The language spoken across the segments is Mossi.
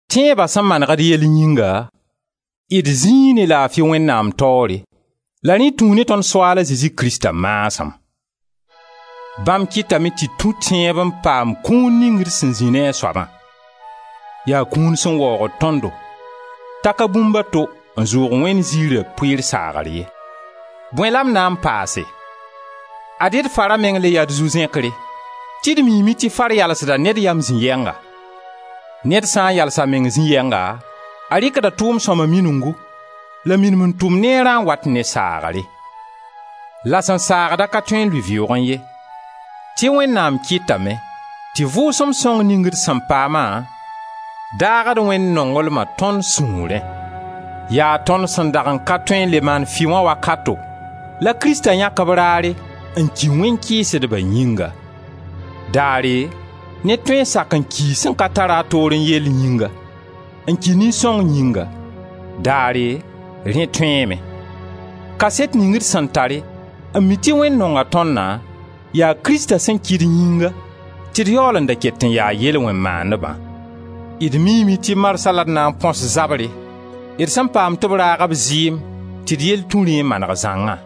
Tẽeba sẽn maneg d yell yĩnga, d zĩi ne laafi Wẽnnaam taoore, la rẽ tũu ne tõnd Soaala Zezi Krista maasem. Bãmb kɩtame tɩ d tũ tẽebo n paam kũun ning d sẽn zĩ ne a soabã; yaa kũun sẽn waoogd tõndo, t'a ka bũmb a to n zʋʋg Wẽnd ziira pʋɩɩr saagr ye. Bõe la m na n paase? Ad-y d fara meng le yaa d zu-zẽkre tɩ d miime tɩ far yalsda ned yam zĩ yɛnga. Ned sã n yals a meng zĩ yɛnga, a rɩkda tʋʋm sõma minugu la minim n tʋm neerã n wat ne saagre. La sẽn saagd-a ka tõe n lʋɩ vɩʋʋgẽ ye tɩ Wẽnnaam kɩtame tɩ Vʋʋsem sõng ning d sẽn paama daagd Wẽnd nonglma tõnd sũurẽ. Yaa tõnd sẽn dag n ka tõe n le maan fɩ wã wakato la Krista yãk b raare n ki wẽn-kɩɩsdba yĩnga. — Daare ned tõe n sak n kii sẽn ka tar-a a toorẽ yelle yĩnga, n ki nin-sõng yĩnga, daare, rẽ tõeeme. — Kaset ning d sẽn tare n mi tɩ Wẽnd nonga tõndã, yaa Krista sẽn ki d yĩnga tɩ d yaool n da ket n ya yel-wẽn-maandbã. D miime tɩ marsã la d na n põs zabre d sẽn paam tɩ b raag b zɩɩm tɩ d yell tũ rẽ n maneg zãngã.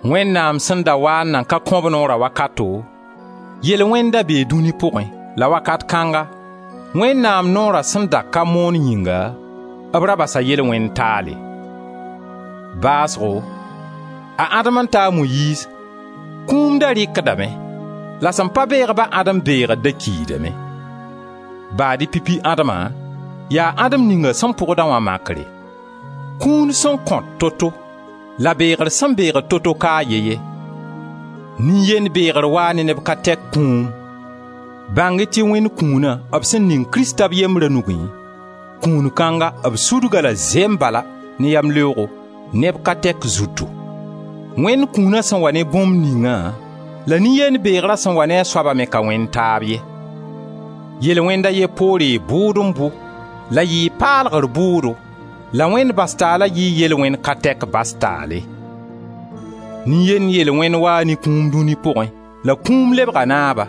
Wẽnnaam sẽn da waa n nan ka kõ b noora wakato, yel-wẽnd da bee dũni pʋgẽ, la wakat kãnga, Wẽnnaam noora sẽn da ka moon yĩnga, b ra basa yel-wẽnd taale. Baasgo a Adem n ta a Moyiiz, kũum da rɩkdame, la sẽn pa beeg-ba a Adem beegr da kiidame; baad-y pipi Adema yaa Adem ninga sẽn pʋgda wã makre. Kũun sẽn kõt to-to, la beegr sẽn beegd to-to ka a ye ye. Nin-yend beegr waa ne neb ka tɛk kũum, bãng-y tɩ Wẽnd kũuna b sẽn ning Krista b yembra nugẽ, kũun kãnga b sudg-a la zembala, ne yamleoogo, neb ka tɛk zutu. Wẽnd kũuna sẽn wa ne bũmb ninga la nin-yend beegra sẽn wa ne a soaba me ka wẽnd taab ye. Yel-wẽnd a ye poore bʋʋd n bʋ la yɩɩ paalgr bʋʋdo la Wẽnd bas taala yɩɩ yel-wẽn ka tɛk bas taale. Nin-yend yel-wẽnd waa ne kũum dũni pʋgẽ la kũum lebga naaba,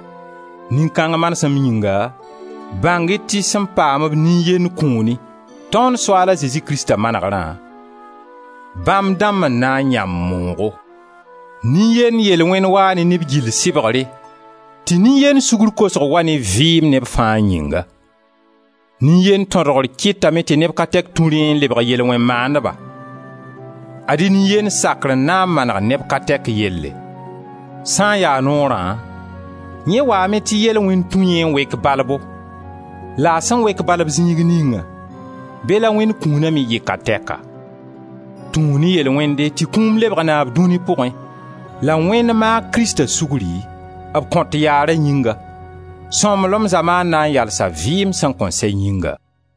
nin-kãng manesem yĩnga, bãng-y tɩ sẽn paam-b nin-yend kũuni, tõnd Soaal a Zezi Krista manegrã, bãmb dãmb n na n yãmb moogo. Nin-yend yel-wẽnd waa ne neb gill sɩbgre, tɩ nin-yend sugr kosg wa ne vɩɩm neb fãa yĩnga. Nin-yend tõdgr kɩtame tɩ neb ka tɛk tũ rẽ n lebg yel-wẽn-maandba, ad-y nin-yend sakr n na n maneg neb ka tɛk yelle. Sã n ya Noorã, yẽ waame tɩ yel-wẽnd tũ yẽ n wek balbo la a sẽn wek balb zĩig ninga, be la Wẽnd kũuna me yɩ ka tɛka. Tũu ne yel-wẽnde tɩ kũum lebg naab dũni pʋgẽ la Wẽnd maag Krista sugri, b kõt yaara yĩnga, sõmblem zamaan na n yalsa vɩɩm sẽn kõn sɛ yĩnga.